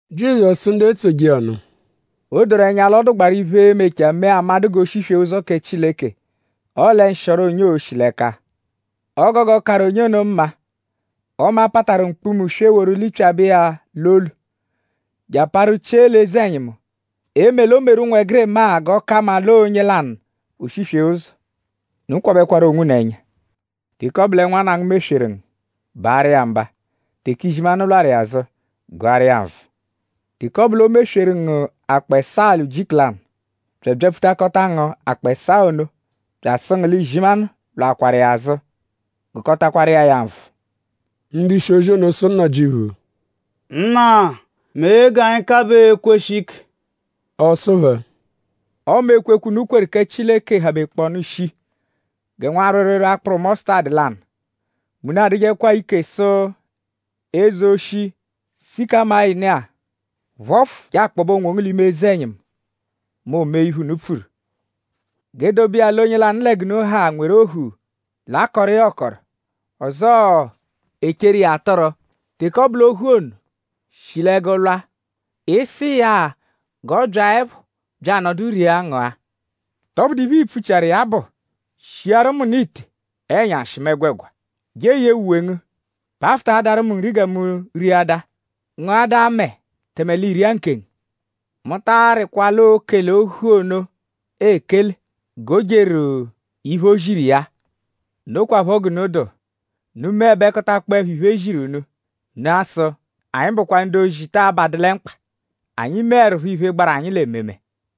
Jizọsu sụ ndu etsoje iya nụ: “O doru ẹnya l'ọ dụgbaaru iphe, e-mechaa mee amadụ g'o shiswee ụzo kẹ Chileke; ọle nshịoro onye oo-shi l'ẹka. O gogo karụ onye ono mma ọme a pataru mkpuma-uswe woru lipyabẹ iya l'olu; je aparu chie l'eze-ẹnyimu; eme l'o meru ụnwegirima-a g'ọ ka mma l'ọo onye lanụ o shiswee ụzo. Unu kwabẹru onwunu ẹnya! “Teke ọ bụ lẹ nwanna ngu mesweru ngu; baarụ iya mba. Teke izimanụ lwarụ iya azụ; gụaru iya nvụ. Teke ọ bụ l'o mesweru ngu akpọ ẹsaa l'ujiku lanụ bya abyapfutakọta ngu akpọ ẹsaa ono; bya asụ ngu l'izimanụ lwaakwaru iya azụ; gụkotakwaru iya ya nvụ.” Ndu-ishi-ozi ono sụ Nnajịuphu: “Nna; mee g'anyi kabaa ekweshi ike!” Ọ sụ phẹ: “Ọme ekwekwe, unu kweru kẹ Chileke habekpọonu shii gẹ nwa rwịirwiirwii akpụru mọsutadu lanụ; mẹ unu adụjekwa ike sụ eze oshi sịkamayinu-a: ‘Phọfu je akpọbe onwongu l'ime eze-ẹnyimu’; mẹ o mee iphe, unu pfuru.” “G'e dobe iya l'onye lanụ lẹ g'unu ha nweru ohu, l'akọru iya ọkoro; ọzoo l'echeru iya atụru. Teke ọ bụ l'ohu ono shi l'ẹgu lwa;?ịi-sụ iya-a g'ọ byaẹpho bya anọdu ria ngụa? ?Tọbudu iphe, ii-pfuchiaru iya bụ: ‘Shiaru mu nụ ite ẹnyashi mu ẹgwegwa; je eyee uwe ngu; pafụtaadaru mu nri gẹ mu riadaa; ngụadaa mẹe tẹme l'i ria nkengu?’ Mu ta arịkwa l'oo-kele ohu ono ekele; g'o jeru iphe, o ziru iya-a. Nokwaphọ g'unu dụ: unu -meẹbekotakpoepho iphe, e ziru unu; unu a-sụ: ‘Anyi bụkwa ndu-ozi, ta abadu lẹ mkpa; anyi meẹrupho iphe, gbaru anyi l'ememe.’”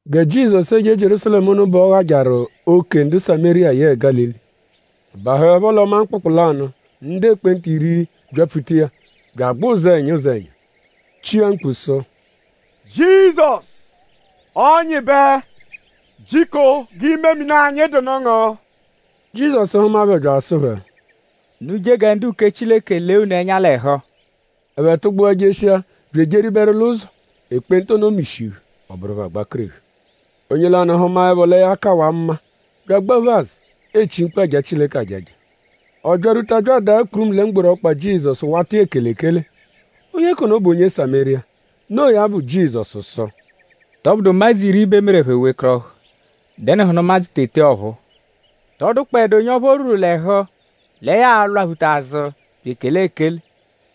Gẹ Jizọsu eje Jierúsalẹmu ono bẹ ọ ghajarụ ókè ndu Samériya yẹe Gálili. Ọ bahụepho l'ọma mkpụkpu lanụ; ndu ekpenta iri byapfuta iya; bya agbẹ ụzenya ụzenya; chia mkpu sụ: “Jizọsu! Ọnyibe! Jiko g'imemini anyi dụnu ngu.” Jizọsu hụma phẹ bya asụ phẹ: “Unu je gẹ ndu-uke Chileke lee unu ẹnya l'ẹhu!” Ẹphe tụgbua jeshia; bya ejeberu l'ụzo; ekpenta ono mishihu; ọ bụru phẹ agbakerehu. Onye lanụ hụmaepho lẹ ya kawaa mma; bya agbaphu azụ; echi mkpu aja Chileke ajaja. Ọ byarwuta bya adaa kpurumu lẹ mgboru ọkpa Jizọsu wata iya ekele ekele. Onye k'ono bụ onye Samériya. Noo ya bụ; Jizọsu sụ: “?Tọbudu ụmadzu iri bẹ e meru ẹphe wekọrohu??Dẹnuhunu ụmadzu tete ọphuu? ?Tọ dụkpoedu onye ọphu o rwuru l'ẹhu lẹ ya a-lwaphuta azụ bya ekele ekele;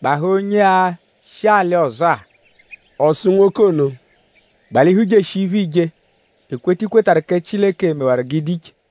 gbahaa onye-a, shi alị ọzo-a?” Ọ sụ nwoke ono: “Gbalihu jeshia iphe, iije. Ekweta, i kwetarụ kẹ Chileke mewaru g'ị dụ iche.”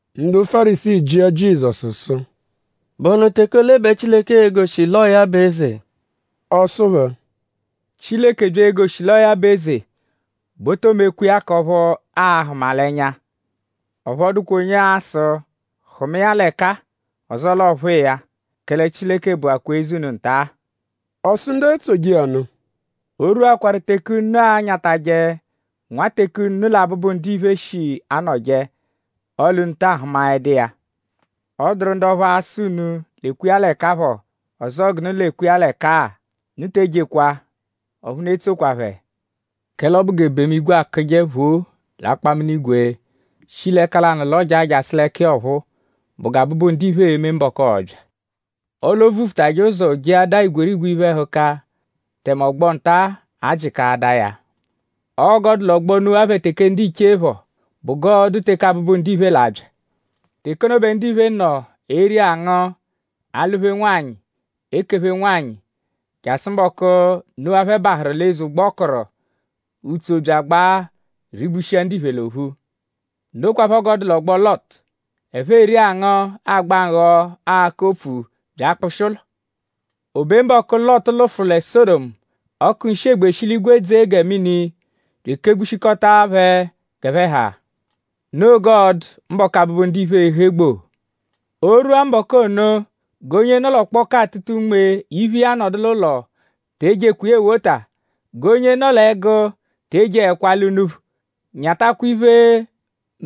Ndu Fárisii jịa Jizọsu sụ: “?Bụhunu teke ole bẹ Chileke e-goshi l'ọo ya bụ eze?” Ọ sụ phẹ: “Chileke -bya egoshi l'ọo ya bụ eze bẹ o too mekwa iya k'ọphu a-hụma l'ẹnya. Ọphu ọ dụkwa onye a-sụ: ‘Hụma iya l'ẹka-a; ọzoo l'ọo phụ iya’; kẹle Chileke bụakwa eze unu nta-a.” Ọ sụ ndu etsoje iya nụ: “Oorwuakwaa teke unu anyatajẹ nwa teke unu lẹ Abụbu-Ndiphe shi anọje; ọle unu taa hụmaedu iya. Ọ dụru ndu ọphu a-sụ unu: ‘Lekwa iya l'ẹka phọ’; ọzoo ‘g'unu lekwa iya l'ẹka-a!’ Unu te ejekwa; ọphu unu etsokwa phẹ. Kẹle ọ bụ g'ebemu-igwe akụje phoo l'akpaminigwe; shi l'ẹka lanụ lọjaa jasụ l'ẹka iya ọphuu bụ gẹ Abụbu-Ndiphe e-me mbọku, ọo-bya. Ọle o vufutajẹ ụzo jeadaa igwerigwe iphe-ẹhuka; tẹme ọgbo-nta-a a-jịkaadaa ya. Ọo g'ọ dụ l'ọgbo Nuwa phẹ teke ndiche phọ bụ g'ọo-dụ teke Abụbu-Ndiphe l'a-bya. Teke ono bẹ ndiphe nọ eri angụ; alụ-phe nwanyị; ekephe nwanyị; jasụ mbọku, Nuwa phẹ bahụru l'eze ụgbo, ọ kụru. Utso bya agbaa; rigbushia ndiphe l'ophu. Nokwaphọ g'ọ dụ l'ọgbo Lọtu. Ẹphe eri angụ; agba nghọ; akọ opfu bya akpụshi ụlo. O be mbọku, Lọtu lụfuru lẹ Sọdomu; ọku nshị-egbe shi l'igwe dzee gẹ mini bya ekegbushikọta phẹ g'ẹphe ha. Noo g'ọo-dụ mbọku, Abụbu-Ndiphe e-he gboo. “O -rwua mbọku ono; g'onye nọ l'ọkpoku atụta unme; iphe iya nọdu l'ụlo; te ejekwa iya ewota. G'onye nọ l'ẹgu te ejeẹkwa ala unuphu. Nyatakwa iphe,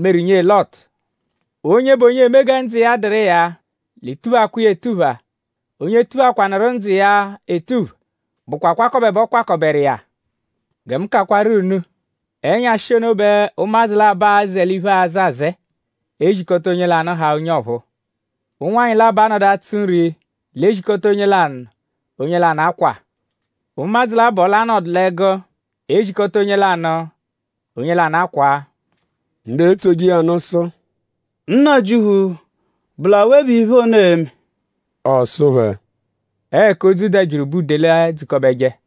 meru nyee Lọtu. “Onye bụ onye eme gẹ ndzụ iya dụru iya l'e-tuphakwa iya etupha. Onye tuphakwanụru ndzụ iya etupha bụkwa akwakọbe bẹ ọ kwakọberu iya. Gẹ mu kakwaru unu; ẹnyashi ono bẹ ụmadzu labọ a-zẹ l'iphe, aazẹ azẹe; e zikọta onye lanụ; haa onye ọphuu. Ụnwanyi labọ a-nọdu atsụ nri; l'e zikọta onye lanụ; onye lanụ akwaa. Ụmadzu labọ l'a-nọdu l'ẹgu; e zikọta onye lanụ; onye lanụ akwaa.” Ndu etsoje iya nụ sụ: “Nnajịuphu;?bụ l'awe bẹ iphe ono e-me?” Ọ sụ phẹ: “Ọo ẹka odzu dabyiru bẹ udele edzukọbeje.”